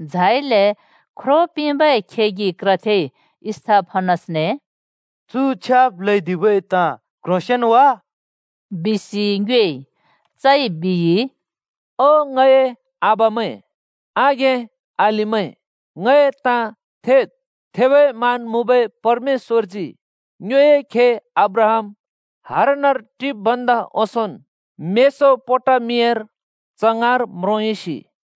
झाइले ख्रो पिंबै खेगि क्रथेइ स्‍तिफनसने “चु छ्याब् ल्हैदिबै ताँ क्ह्रोंसेंन् वा?” बिसि ङ्योएइ। चइ बिइ, “ओ ङए आबामैं, आघें-अलिमैं, ङए ताँ थेद्। थेबै मान मुँबै परमेश्‍वरजी ङ्योए खे अब्राहाम हारानर टिब् भन्दा ओंसोंन् मेसोपोटामियार च ङाँर म्रोंयुसि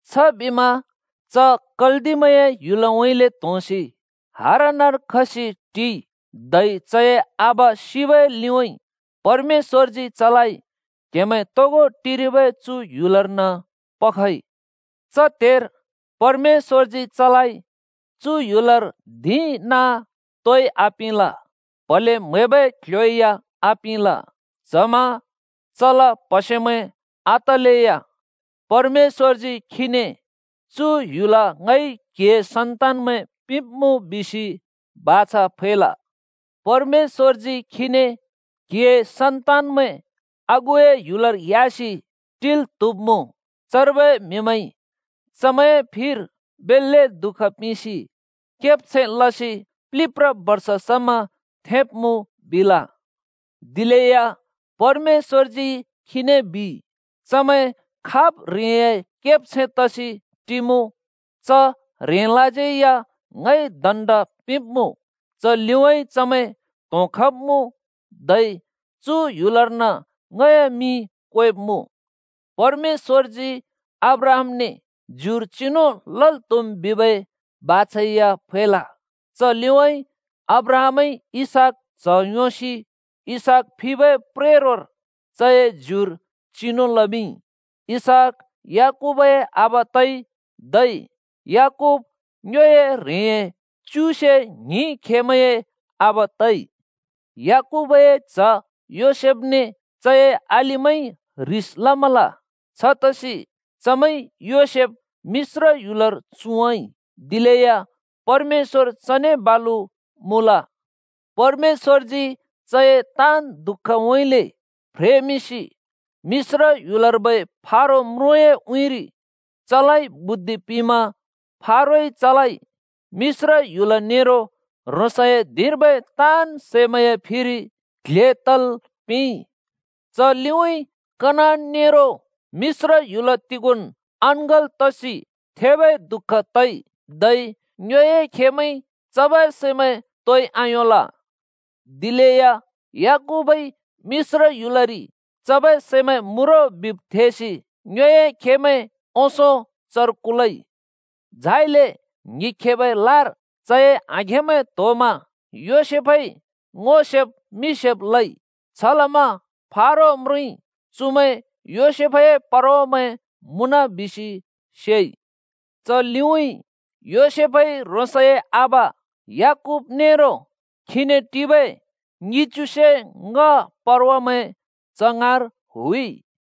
“छबिमा च कल्दिमैंए ह्‍युलउँइँले त्होंसि हारानर खसि टिइ, धै चए आबा सिबै लिउँइँ परमेश्‍वरजी चलाइ क्हेमैं तोगो टिरिबै चु ह्‍युलर्न पखइ। च त्हेर परमेश्‍वरजी चलाइ चु ह्‍युलर धिं नाँ तोइ आपिंल, प्हले म्हैबै क्ल्ह्‍यो या आपिंल। च्हमा चला प्हसेमैं आतलेया परमेश्‍वरजी खीने ‘चु ह्‍युल ङइ क्हिए सन्तान्‍मैं पिंब्मुँ’ बिसि बाछा फैल। परमेश्‍वरजी खीने, ‘क्‍हिए सन्‍तान्मैं आगुए ह्‍युलर ह्‍यासि टिल् त्हुब्मुँ। चर्बै म्हिमैंइ चमैं फिर बेल्‍ले दुःख पिंसि केब्छैं लसि प्लिब्ब्रा बर्ष समा थेंब्मुँ,’ बिल दिलेया परमेश्‍वरजी खीने बिइ, ‘चमैं खाब् ह्रेंए केब्छैं तसि टिमुँ च ह्रेंलाज्यै या ङइ दण्ड पिंब्मुँ। च लिउँइँ चमैं त्होंखब्मुँ धै चु क्ल्ह्‍योर्न ङए मिं क्वेब्मुँ।’ परमेश्‍वरजी अब्राहामने ज्युर चिनु लल् त्हुम् बिबै बाछा या फैल। च लिउँइँ अब्राहामइ इसहाक च्ह योंसि इसहाक फिबै प्रेरोर चए ज्युर चिनु लमिंइ। इसहाक याकूबए आबा तइ, धै याकूब ङ्योए ह्रेंए च्युसे ङ्हिं खेमैंए आबा तइ। “याकूबए च्ह योसेफने चए अलिमैंइ ह्रिस लमल। छतसि चमैंइ योसेफ मिश्र ह्‍युलर चुँवाँइ। दिलेया परमेश्‍वर चने बालु मुँल, परमेश्‍वरजी चए ताँन् दुःखउँइँले फ्रेमिंसि मिश्र ह्‍युलर्बै फारो म्रुँए उँइँरि चलाइ बुद्धि पिंमा फारोइ चलाइ मिश्र ह्‍युल नेरो ह्रोंसए धिंर्बै ताँन् सैमैंए फिरि क्ल्हे तल् पिंइ। च लिउँइँ कनान नेरो मिश्र ह्‍युल तिगोंन् अङ्गल् तसि थेबै दुःख तइ, धै ङ्योए खेमैंइ चबै सैमैं तोइ आयोंल। दिलेया याकूबइ मिश्र ह्‍युलरि चबै सैमैं मुँ रो बिब् थेसि ङ्योए खेमैं ओंसों चर कुलइ। झाइले ङ्हिखेबै लार चए आघेंमैं त्होमा योसेफइ ङो सेब् मि सेब् लइ। छलमा फारो म्रुँइ चुमैं योसेफए परवामैं मुँन बिसि सेइ। च लिउँइँ योसेफइ ह्रोंसए आबा याकूब नेरो खीने टिबै ङिच्युसे ङ्‍ह (पचत्तर) परवामैं च ङाँर हुइ।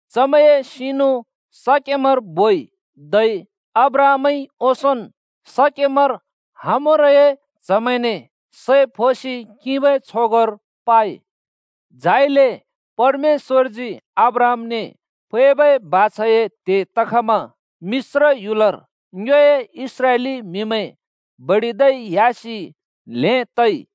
चमैंए सिनु शकेमर बोइ, धै अब्राहामइ ओंसोंन् शकेमर हामोरए च्हमैंने सै फोसि किंबै छगोंर पाइ। “झाइले परमेश्‍वरजी अब्राहामने फैबै बाछाए त्हे तखमा मिश्र ह्‍युलर ङ्योए इस्राएली म्हिमैं बडिदै ह्‍यासि ल्हें तइ।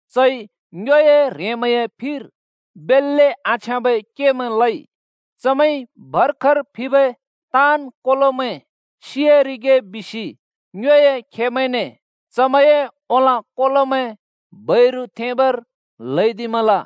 चइ ङ्योए ह्रेंमैंए फिर बेल्‍ले आछ्याँबै केमै लइ चमैंइ भर्खर फिबै ताँन् कोलोमैं सियारिगे बिसि ङ्योए खेमैंने चमैंए ओंलाँ कोलोमैं बैरु थेंबर ल्हैदिमल।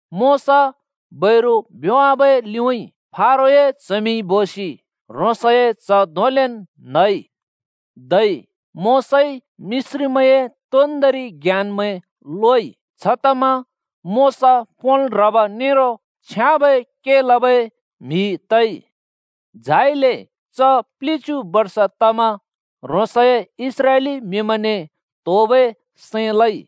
मोशा बैरु भ्योंवाबै लिउँइँ फारोए च्हमिंइ बोसि ह्रोंसए च्ह धोंलेन् न्हइ। धै मोशाइ मिश्रीमैंए तोन्दोंरि ज्ञानमैं लोइ। छतमा मोशा पोंल् ह्रब नेरो छ्याँबै के लबै म्हि तइ। “झाइले च प्लिच्यु बर्ष तमा ह्रोंसए इस्राएली म्हिमैंने त्होबै सैं लइ।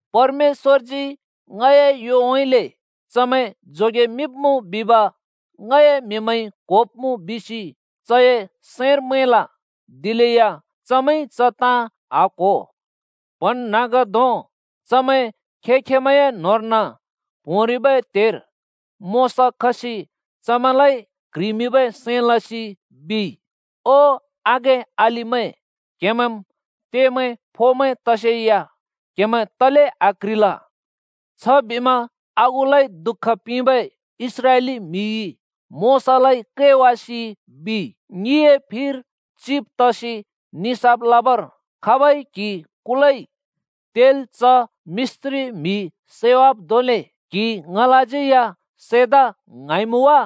‘परमेश्‍वरजी ङए योउँइँले चमैं जोगेमिंब्मुँ बिब ङए म्हिमैंइ क्होब्मुँ’ बिसि चए सैंर मैंल। दिलेया चमैंइ च ताँ आक्हो। “प्हँन्हाँग्धों चमैं खें-खेंमैंए न्होंर्न प्होंरिबै त्हेर मोशा खसि चमैंलाइ क्ह्रिमिंबै सैं लसि बिइ, ‘ओ आघें-अलिमैं, क्हेमैंम् त्येमैं फोमैं तसेया क्हेमैं तले आक्ह्रिल?’ छबिमा आगुलाइ दुःख पिंबै इस्राएली म्हिइ मोशालाइ कैवासि बिइ, ‘ङिए फिर चिब् तसि निसाफ लबर खाबइ क्हि कुलइ? तेल् च मिश्री म्हि सैवाब् धोंले क्हिइ ङलाज्यै या सैदा ङ्हाँइमुँ वा?’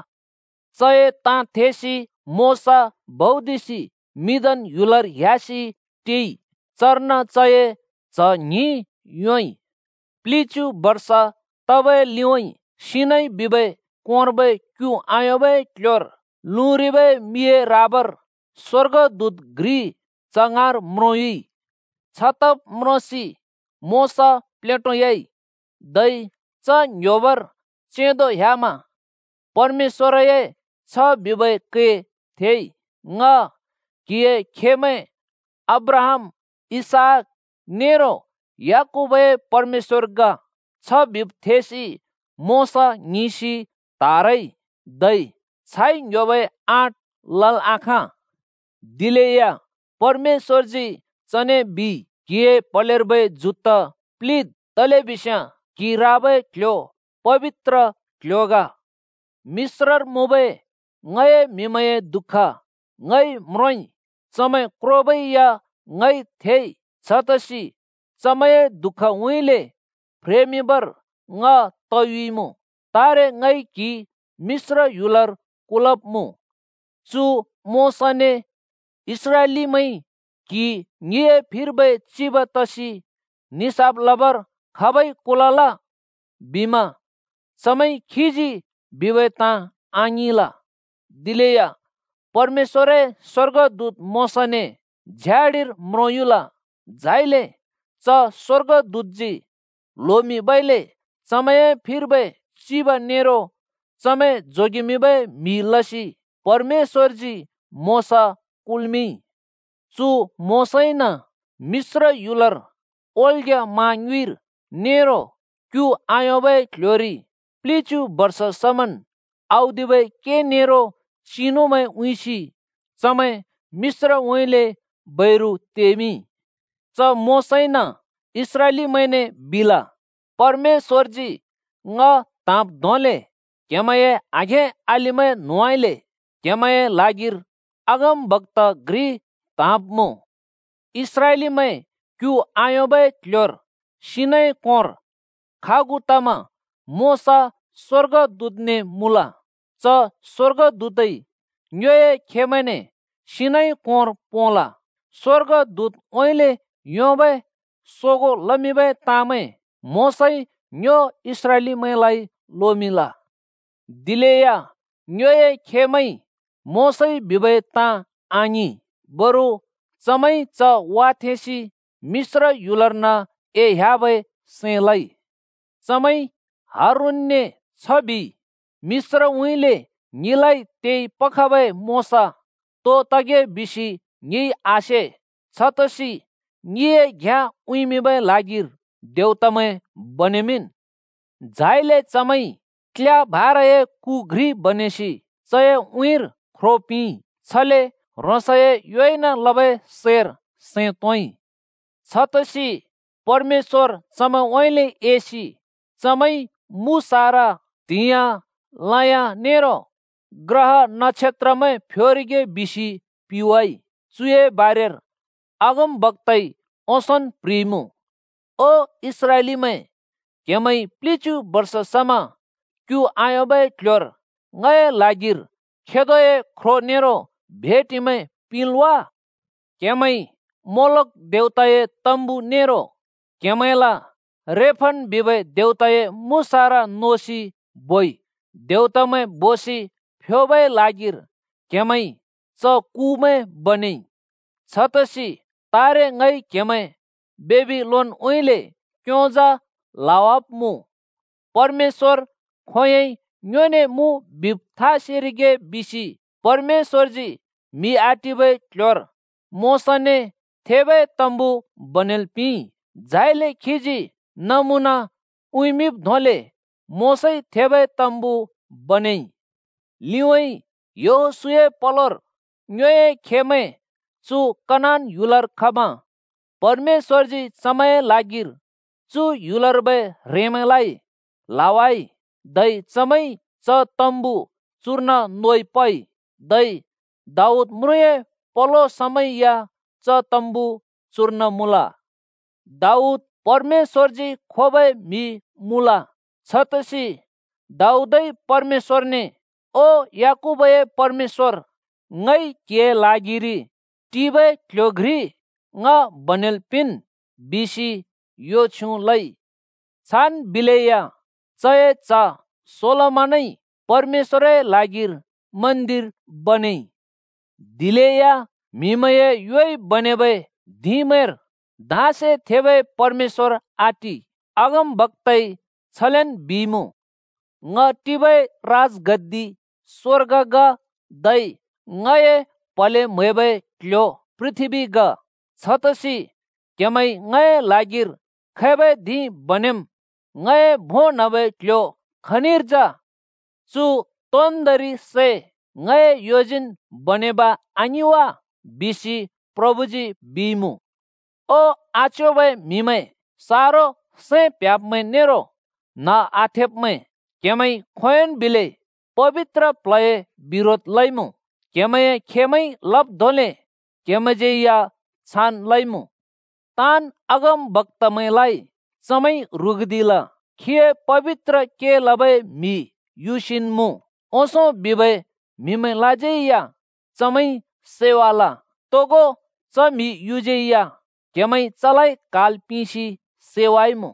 चए ताँ थेसि मोशा भौदिसि मिद्यान ह्‍युलर ह्‍यासि टिइ। चर्न चए च्ह ङ्हिं योंइ। “प्लिच्यु बर्ष तबै लिउँइँ सिनै बिबै कोंर्बै क्यु आयोंबै क्ल्ह्‍योर लुँरिबै मिए राबार स्वर्गदूत घ्रि च ङाँर म्रोंयुइ। छतब् म्रोंसि मोशा प्लेटोयाइ, धै च ङ्‍ह्‍योबर चेंदो ह्‍यामा परमेश्‍वरए छ बिबै कै थेइ, ‘ङ क्‍हिए खेमैं अब्राहाम, इसहाक नेरो याकूबए परमेशवर ग।’ छ बिब् थेसि मोशा ङ्हिंसि त्हारइ, धै छाइ ङ्‍ह्‍योबै आँट लल् आखाँ। “दिलेया परमेश्‍वरजी चने बिइ, ‘क्‍हिए प्हलेर्बै जुत्ता प्‍लिवाद्, तलेबिस्याँ क्‍हि राबै क्‍ल्‍ह्‍यो पबित्र क्ल्ह्‍यो ग। मिश्रर मुँबै ङए म्‍हिमैंए दुःख ङइ म्रोंइ, चमैं क्रोबै या ङइ थेइ। छतसि चमैंए दुःखउँइँले फ्रेमिंबर ङ तयुइमुँ। तारे ङइ क्हि मिश्र ह्‍युलर कुलब्मुँ।’ “चु मोशाने इस्रालिमैंइ ‘क्हि ङिए फिर्बै चिब तसि निसाफ लबर खाबइ कुलल?’ बिमा चमैंइ खीजी बिबै ताँ आङिंल। दिलेया परमेश्‍वरए स्वर्गदूत मोशाने झ्याडिर म्रोंयुल। झाइले च स्वर्गदूतजी ल्होमिंबइले चमैंए फिर्बै चिब नेरो चमैं जोगेमिंबै म्हि लसि परमेश्‍वरजी मोशा कुल्मिंइ। चु मोशाइन मिश्र ह्‍युलर, ओल्ग्या मा ङ्युँइर, नेरो क्यु आयोंबै क्ल्ह्‍योरि प्लिच्यु बर्ष समन् औदिबै के नेरो चिनुमैं उँइँसि चमैं मिश्रउँइँले बैरु तेमिंइ। “च मोशाइन इस्राएलीमैंने बिल, ‘परमेश्‍वरजी ङ त्हाँब् धोंले क्हेमैंए आघें-अलिमैं न्होंउँइँले क्हेमैंए ल्हागिर अगमबक्‍ता घ्रि त्हाँब्मुँ।’ इस्राएलीमैं क्यु आयोंबै क्ल्ह्‍योर सिनै कोंर खागु तमा मोशा स्वर्गदूतने मुँल। च स्वर्गदूतइ ङ्योए खेमैंने सिनै कोंर पोंल। स्वर्गदूतउँइँले योंबै सोगों लमिंबै ताँमैं मोशाइ ङ्यो इस्राएलीमैंलाइ लोमिंल। “दिलेया ङ्योए खेमैंइ मोशाइ बिबै ताँमैं आङिंल। बरु चमैंइ च वाथेंसि मिश्र ह्‍युलर्न एह्‍याबै सैं लइ। चमैंइ हारूनने छ बिइ, ‘मिश्रउँइँले ङिलाइ तेपखबै मोशा तो तगे बिसि ङिइ आसे। छतसि ङिए घ्याँ उँइँबै ल्हागिर देवतामैं बनेमिंन्।’ झाइले चमैंइ क्ल्या भाराए कु (मूर्ति) घ्रि बनेसि चए उँइँर ख्रो पिंइ, छले ह्रोंसए योइन लबै सैर सैं तोंइ। छतसि परमेश्‍वर चमैंउँइँले एसि, ‘चमैंइ मुसारा, त्हियाँ, लयाँ नेरो ग्रहा-नक्षत्रमैं फ्योरिगे’ बिसि पिवाइ। चुए बारेर अगमबक्‍ताइ ओंसोंन् प्ह्रिइमुँ, ओ इस्राएलीमैं! क्हेमैइ प्‍लिच्‍यु बर्ष स‍मा क्यु आयोंबै क्ल्ह्‍योर ङए ल्हागिर खेदोए ख्रो नेरो भेटिमैं पिंल् वा? क्‍हेमैंइ मोलोख देवताए तम्‍बु नेरो क्हेमैंला रेफन बिबै देवताए मुसारा नोसि बोइ। ‘देवतामैं’ बिसि फ्योबै ल्हागिर क्हेमैंइ च कुमैं बनेइ। छतसि तारे ङइ क्हेमैं बेबिलोनउँइँले क्योंजा ल्हवाब्मुँ। “परमेश्‍वर खोंयोंइ ङ्योने मुँ बिब् था सेरिगे बिसि परमेश्‍वरजी म्हि आटिबै क्ल्ह्‍योर मोशाने थेबै तम्‍बु बनेल् पिंइ। झाइले खीजी नमुना उँइँमिंब् धोंले मोशाइ थेबै तम्‍बु बनेइ। लिउँइँ यहोशूए पलोर ङ्योए खेमैं चु कनान ह्‍युलर खमा परमेश्‍वरजी चमैंए लागिर चु ह्‍युलर्बै ह्रेंमैंलाइ ल्‍हावाइ। धै चमैंइ च तम्‍बु चुर्न नोइ पइ। धै दाऊद म्रुँए पलो समा या च तम्‍बु चुर्न मुँल। दाऊद परमेश्‍वरजी खोबै म्हि मुँल, छतसि दाऊदइ परमेश्‍वरने, ‘ओ याकूबए पेरमेश्‍वर, ङइ क्हिए ल्हागिरि पक्कि टिबै क्ल्ह्‍यो घ्रि ङ बनेल् पिंन्,’ बिसि यो छ्युँ लइ। छान् बिलेया चए च्ह सोलोमनइ परमेश्‍वरए ल्हागिर मन्दिर बनेइ। “दिलेया म्हिमैंए योइ बनेबै धिंमैंर धाँसे थेबै परमेश्‍वर आटि। अगमबक्‍ताइ छलेन बिइमुँ, ‘ङ टिबै राजगद्दि स्वर्ग ग, धै ङए प्‍हले म्हैबै क्‍ल्‍ह्‍यो पृथ्‍बी ग। छतसि क्‍हेमैंइ ङए ल्हागिर खैबै धिं बनेम्? ङए भों न्‍हबै क्‍ल्‍ह्‍यो खनिर जा? चु तोन्दोंरि सै ङए योजीन् बनेब आङिं वा?’ बिसि प्रभुजी बिइमुँ। “ओ, आच्योबै म्हिमैं, सारो सैं प्ह्‍‍याब्मैं नेरो न्ह आथेब्मैं! क्हेमैंइ खोंयोंन् बिलै पबित्र प्ल्हए बिरोध लइमुँ। क्हेमैंए खेमैंइ लब् धोंले क्हेमैंज्यै या छान् लइमुँ। ताँन् अगमबक्‍तामैंलाइ चमैंइ ह्रुगुदिल! खीए पबित्र के लबै म्हि युसिन् मुँ ओंसों बिबै म्हिमैंलाज्यै या चमैंइ सैवाल। तोगो च म्हि युज्यै या क्हेमैंइ चलाइ क्हाल् पिंसि सैवाइमुँ।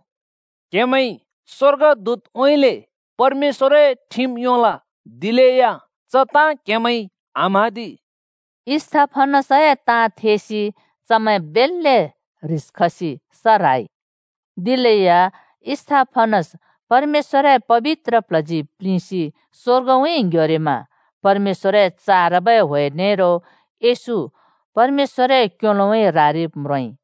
क्हेमैंइ स्वर्गदूतउँइँले परमेश्‍वरए ठिम योंल, दिलेया च ताँ क्हेमैंइ आम्हाँदि।” स्तिफनसए ताँ थेसि चमैं बेल्‍ले ह्रिस खसि स ह्राइ। दिलेया स्तिफनस परमेश्‍वरए पबित्र प्ल्हजी प्लिंसि स्वर्गउँइँ ङ्ह्‍योरिमा परमेश्‍वरए चारबै ह्‍वे नेरो येशू परमेश्‍वरए क्योलोउँइँ रारिब् म्रोंइ।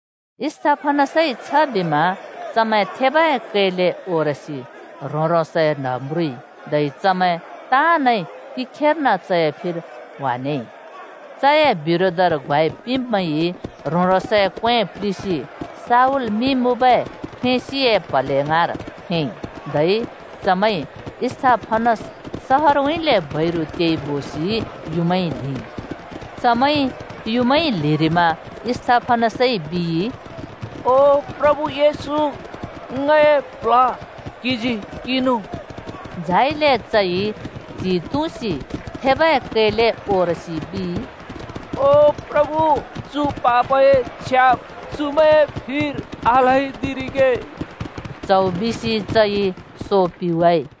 स्तिफनसइ छबिमा चमैं थेबै कैले ओरसि ह्रों-ह्रोंसए न्ह म्रुइ। धै चमैं ताँनइ तिखेर्न चए फिर ह्‍वानेइ। चए बिरोधर ग्वाइ पिंब्मैंइ ह्रों-ह्रोंसए क्वें प्लिसि शाऊल मिं मुँबै फ्रेंसिए प्हले ङाँर थेंइ। धै चमैंइ स्तिफनस सहरउँइँले बैरु तेइ बोसि युँमाइ ल्हिइ। चमैंइ युँमाइ ल्हिरिमा स्तिफनसइ बिइ, “ओ प्रभु येशू, ङए प्ल्ह क्हिजी किंनु।” झाइले चइ च्हि तुँसि थेबै कैले ओरसि बिइ, “ओ प्रभु, चु पापए छ्याब चुमैंए फिर आल्हैदिरिगे।” च्हौ बिसि चइ सो पिवाइ।